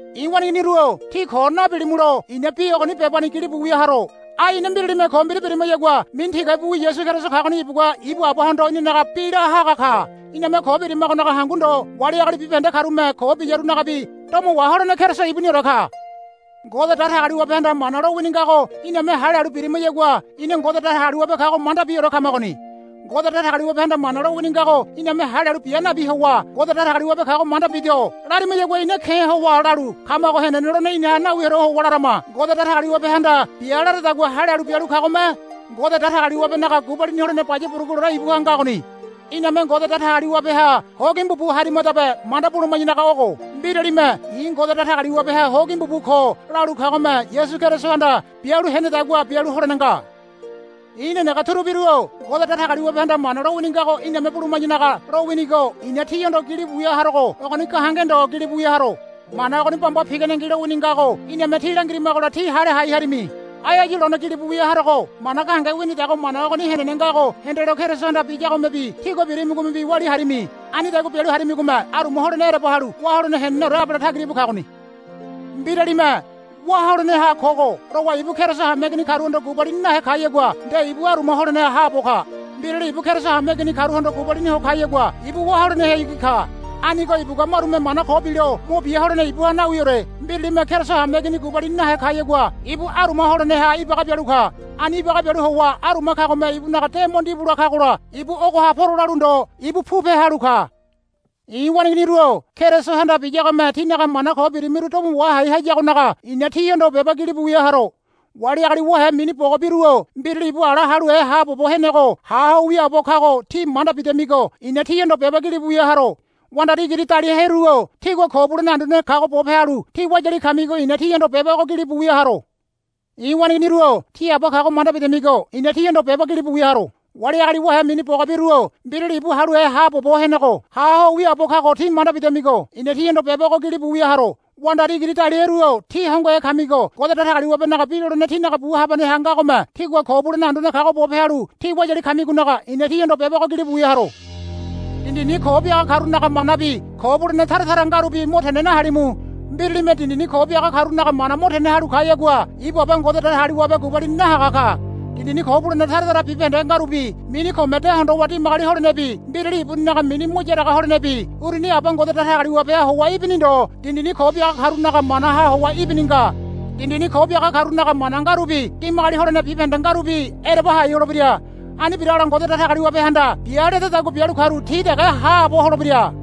I̱ waneiginiru-o tí ko nabilimulo i̱na bi ogoni bebani gili bialu lawia haro. Ai ina mbiralime ko mbira birimayagua mini tigabiwi Yasu Keriso kagoni ibugua ibu Abahondo inanaga bi la haga ka. Iname ko birimagonaga hangu ndo wali agali bibahende karume ko biyarunagabi domo waholene Keriso ibuniore ka. Ngode Datagaliwabehanda mana lowini ngago iname hale halu birimayagua ina Ngode Datagaliwabe kago mandabiore kamagoni. Ngode Datagaliwabehanda mana lowini ngago iname hale halu bia nabi howa, Ngode Datagaliwabe kago manda bido, larimayagua ina ke̱ howa lalu kamago henene lolene inaha nawiore howa larama. Ngode Datagaliwabehanda, Bia, laradagua hale halu bialu kagome Ngode Datagaliwabenaga gubalini holene baya buruguleore ibuha ngagoni. Iname Ngode Datagaliwabeha hogimbu bu harimadabe manda buluma̱yanaga ogo. Mbiralime, I̱ Ngode Datagaliwabeha hogimbu bu ko, lalu kagome Yasu Kerisohanda bialu henedagua bialu holene nga. I̱ nenege turubiru-o Ngode Datagaliwabehanda mana lowini ngago iname buluma̱yanaga lowinigo i̱na tíhondo gilibu wia harogo ogoni gahenge ndo gilibu wia haro. Mana ogoni bamba piganengi lowini ngago iname tí langirimagola tí hale hai harimi. Ai áyu lone gilibu wia harogo mana gahenge winidago mana ogoni henene ngago hendelo Kerisohanda biyagomebi tígua birimigomebi walia harimi. Anidagua bialu harimigome aruma holene ereba halu wá holene heneneore abale tagira íbu kagoni. Mbiralime, Wá holeneha kogo, lowa ibu Keriso hameigini karuhondo gubalini nahe kayagua nde ibu aruma holeneha haabo ka. Mbirali ibu Keriso hameigini karuhondo gubalini ho kayagua ibu wá holenehayagi ka. Anigo ibugua marume mana ko bilo mo bia holene ibuha nawiore. Mbiralime Keriso hameigini gubalini nahe kayagua ibu aruma holeneha ibaga bialu ka. Ani ibaga bialu howa aruma kagome ibunaga de mo ndibula kagola ibu ogoha poro lalu ndo ibu pupe halu ka. I̱ waneiginiru-o Kerisohanda biyagome tínaga mana ko birimiru domo wahai hayagonaga i̱na tíhondo beba gilibu wia haro. Wali agali wahe mini bogabiru-o mbirali ibu ala haluhe haabobo henego ha ho wiaabo kago tí manda bidamigo i̱na tíhondo beba gilibu wia haro. Wandari igiri daliaheru-o tígua Ko Bulene Anduane kago bope halu tí wayali kamigo i̱na tíhondo beba ogo gilibu wia haro. I̱ waneiginiru-o tí Aba kago manda bidamigo i̱na tíhondo beba gilibu wia haro. Wali agali wahe mini bogabiru-o mbirali ibu haluhe haabobo henego ha ho wiaabo kago tí manda bidamigo i̱na tíhondo beba ogo gilibu wia haro. Wandari igiri daliaheru-o tí hongohe kamigo Ngode Datagaliwabenaga bi lolene tínaga bu habaneha ngagome tígua Ko Bulene Anduane kago bope halu tí wayali kamigonaga i̱na tíhondo beba ogo gilibu wia haro. Dindini ko biaga karunaga manabi ko bulene tara tara ngarubi mo tene nahalimu. Mbiralime dindini ko biaga karunaga mana mo tene halu kayagua ibu Aba Ngode Datagaliwabe gubalini nahaga ka. Dindini ko bulene tara tara bibahende ngarubi mini kome de hondowa dimagoli holenebi mbirali ibuninaga mini mo yaraga holenebi uruni Aba Ngode Datagaliwabeha howa ibini ndo dindini ko biaga karunaga manaha howa ibini nga. Dindini ko biaga karunaga mana ngarubi dimagoli holene bibahende ngarubi ereba hai holebira. Ani biragola Ngode Datagaliwabehanda, Bia, ledadagua bialu karu ti dege haabo holebira.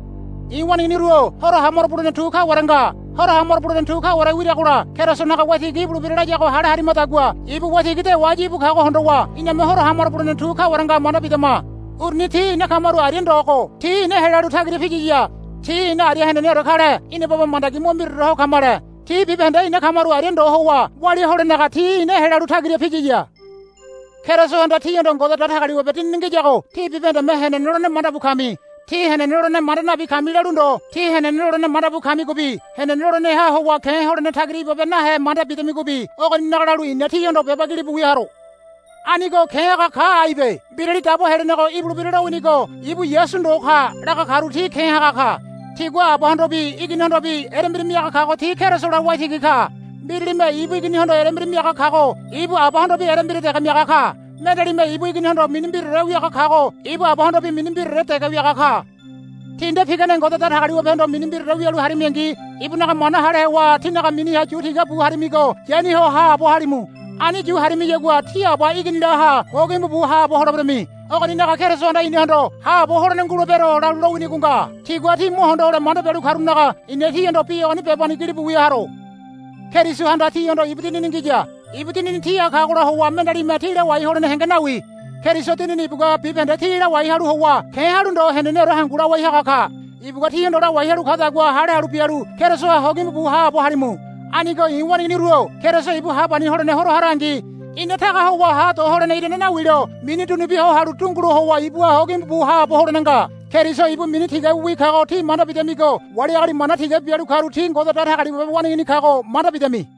I̱ waneiginiru-o horo hamaro bulene tu kaware nga. Horo hamaro bulene tu kaware wiragola Kerisonaga Waitigi ibulebira layago hale harimadagua ibu waitigi dewa áyu íbu kago hondowa iname horo hamaro bulene tu kaware nga manda bidama. Uruni ti ina kamaru aria ndogo ti ina helalu tagira piyiya. Ti ina aria heneneore kale ina baba mandagi mo mbiraore ho kamale. Ti bibahende ina kamaru aria ndo howa walia holenaga ti ina helalu tagira piyiya. Kerisohanda tíhondo Ngode Datagaliwabe Dinini ngiyago tí bibahendeme henene lolene mandabu kami. Tí henene lolene manda nabi kami lalu ndo tí henene lolene mandabu kamigobi henene loleneha howa ke̱ holene tagira ibabe nahe manda bidamigobi ogoninaga lalu i̱na tíhondo beba gilibu wia haro. Anigo ke̱ haga ka aibe. Mbirali Dabo Helenego ibulebira lowinigo ibu Yasu ndo ka, laga karu ti ke̱ haga ka. Tigua Abahondobi Iginihondobi erembira miaga kago ti Kerisola Waitigi ka. Mbiralime ibu Iginihondo erembira miaga kago ibu Abahondobi erembira dege miaga ka. Mendealime ibu Iginihondo mini mbiraore wiaga kago ibu Abahondobi mini mbiraore dege wiaga ka. Tí nde pigane Ngode Datagaliwabehondo mini mbiraore wialu harimingi ibunaga mana hale howa tínaga miniha yu tigabu harimigo yani ho haabo halimu. Ani yu harimiyagua tí Aba Iginilaha hogimbu bu haabo holeberami. Ogoninaga Kerisohanda inahondo, Haabo holene ngulebero, lalu lowinigo nga. Tigua tí mo hondo hole manda bialu karunaga i̱na tíhondo bi ogoni bebani gilibu wia haro. Kerisohanda tíhondo ibu Dinini ngiya. Ibu Dinini tíha kagola howa mendealime tí lawai holene henge nawi. Keriso Dinini ibugua bibahende tí lawai halu howa ke̱ halu ndo heneneore hangu lawai haga ka. Ibugua tíhondo lawai halu kadagua hale halu bialu Kerisoha hogimbu bu haabo halimu. Anigo i̱ waneiginiru-o Keriso ibu hapani holene Horo harangi ina taga howa ha do holene irane nawilo mini dunubia ho halu dungulo howa ibuha hogimbu bu haabo holene nga. Keriso ibu mini tigabiwi kago tí manda bidamigo wali agali mana tigabi bialu karu ti Ngode Datagaliwabe waneigini kago manda bidamini.